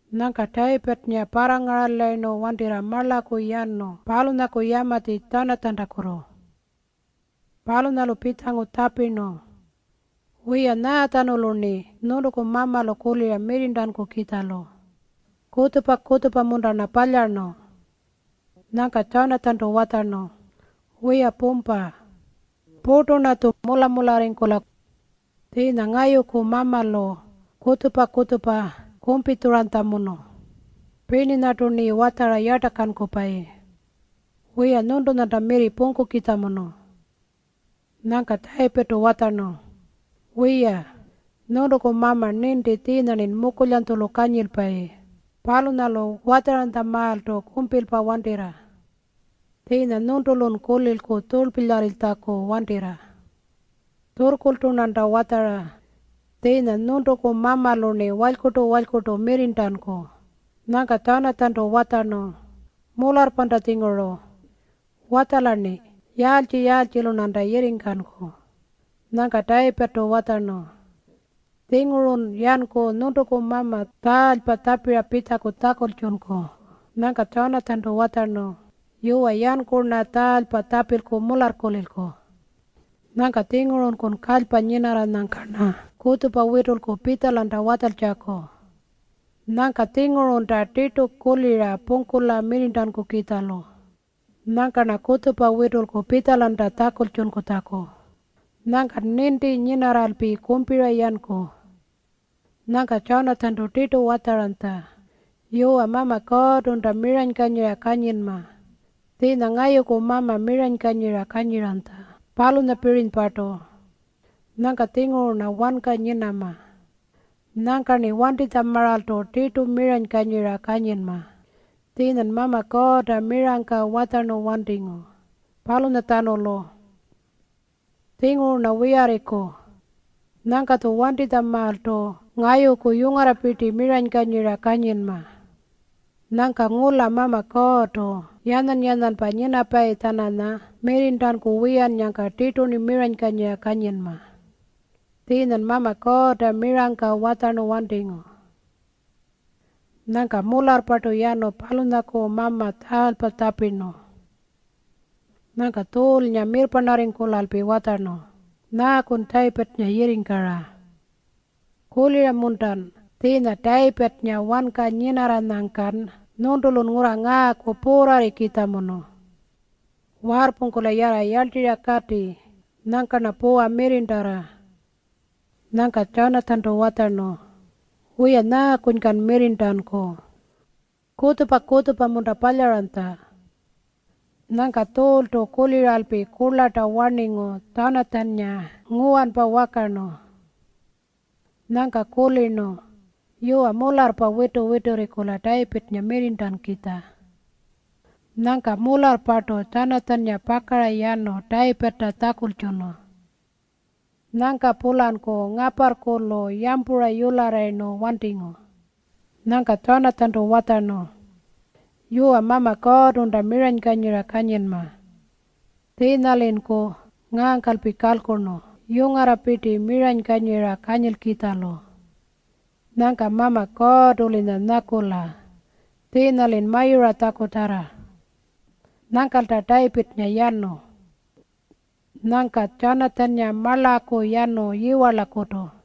Nyangka Tayipirrnga parrangaralayirnu wantirra marlaku yanu palunyaku yamatji Tjanatjantakutu. Palunyalu pitjangu tjapirnu, “Wiya, nyaatjanulu-rni nyuntuku mamalu kulira mirrirntankukitjalu? Kutjupa-kutjupa-munta-rna palyarnu?” Nyangka Tjanatjantu watjarnu, “Wiya pumpa! Purtu-rnatju mula-mularringkula. Tjiinya ngayuku mamalu kutjupa-kutjupa kumpitjuranytjamunu, pirninyartu-rni watjara yartakankupayi. Wiya, nyuntunyanta mirri pungkukitjamunu.” Nyangka Tayipirrtu watjarnu, “Wiya, nyuntuku mama ninti tjiinya-rnin mukulyanytjulu kanyilpayi. Palunyalu watjaranytjamaaltu kumpilpa wantirra. Tjiinya nyuntulun kulilku tjurlpilyarritjaku wantirra. Tjurrkurltu-rnanta watjara tjiinya nyuntuku mamalu-rni walykurtu-walykurtu mirrirntanku.” Nyangka Tjanatjantu watjarnu, “Mularrpanta-tjinguru. Watjala-rni. Yaaltji-yaaltjilu-rnanta yirringkanku?” Nyangka Tayipirrtu watjarnu, “Tjingurun yanku nyuntuku mama tjarlpa tjapira pitjaku tjakultjunku.” Nyangka Tjanatjantu watjarnu, “Yuwa, yanku-rna tjarlpa tjapilku mularrkulilku. Nyangka-tjingurunku kalypa nyinarranyangka-rna kutjupa witulku pitjalanta watjaltjaku. Nyangka-tjingurunta tirtu kulira pungkula mirrirntankukitjalu. Nyangka-rna kutjupa witulku pitjalanta tjakultjunkutjaku. Nyangkan ninti nyinarralpi kumpira yanku.” Nyangka Tjanatjantu tirtu watjaranytja, “Yuwa, Mama Kuurrtunta miranykanyira kanyinma, tjiinya ngayuku mama miranykanyira kanyiranytja, palunyapirinypartu. Nyangka-tjinguru-rna wanka nyinama. Nyangka-rni wantinytjamaaltu tirtu miranykanyira kanyinma, tjiinyan Mama Kuurrta mirangka watjarnu wantingu, palunyatjanulu. Tjinguru-rna wiyarriku. Nyangka-tju wantinytjamaaltu ngayuku yungarrapirti miranykanyira kanyinma. Nyangka ngula Mama Kuurrtu yanyan-yanyanpa nyinapayi-tjananya mirrirntanku wiyannyangka tirtu-rni miranykanyira kanyinma, tjiinyan Mama Kuurrta mirangka watjarnu wantingu.” Nyangka mularrpartu yanu palunyaku mama tjarlpa tjapirnu. Nyangka Tjuulnga mirrparnarringkulalpi watjarnu, “Nyaakun Tayipirrnga yirringkara? Kulira-muntan tjiinya Tayipirrnga wanka nyinarranyangkan nyuntulu ngurra ngaaku puurrarrikitjamunu? Waarrpungkula yarra yarltirra kati. Nyangka-rna puwa mirrirntarra.” Nyangka Tjanatjantu watjarnu, “Wiya, nyaakunykan mirrirntanku? Kutjupa-kutjupa-munta palyaranytja?” Nyangka Tjuultu kuliralpi kurlarta warningu Tjanatjannga nguwanpa wakarnu. Nyangka kulirnu, “Yuwa, mularrpa witu-witurringkula Tayipirrnga mirrirntankukitja.” Nyangka mularrpartu Tjanatjannga pakara yanu Tayipirrta tjakultjunu. Nyangka-pulanku ngaparrkulu yampura yularrayirnu wantingu. Nyangka Tjanatjantu watjarnu, “Yuwa, Mama Kuurrtunta miranykanyira kanyinma. Tjiinya-linku ngaangkalpi kalkurnu yungarrapirti miranykanyira kanyilkitjalu. Nyangka Mama Kuurrtu-linya nyakula tjiinya-lin mayuratjakutarra.” Nyangkalta Tayipirrnga yanu. Nyangka Tjanatjannga marlaku yanu yiwarlakutu.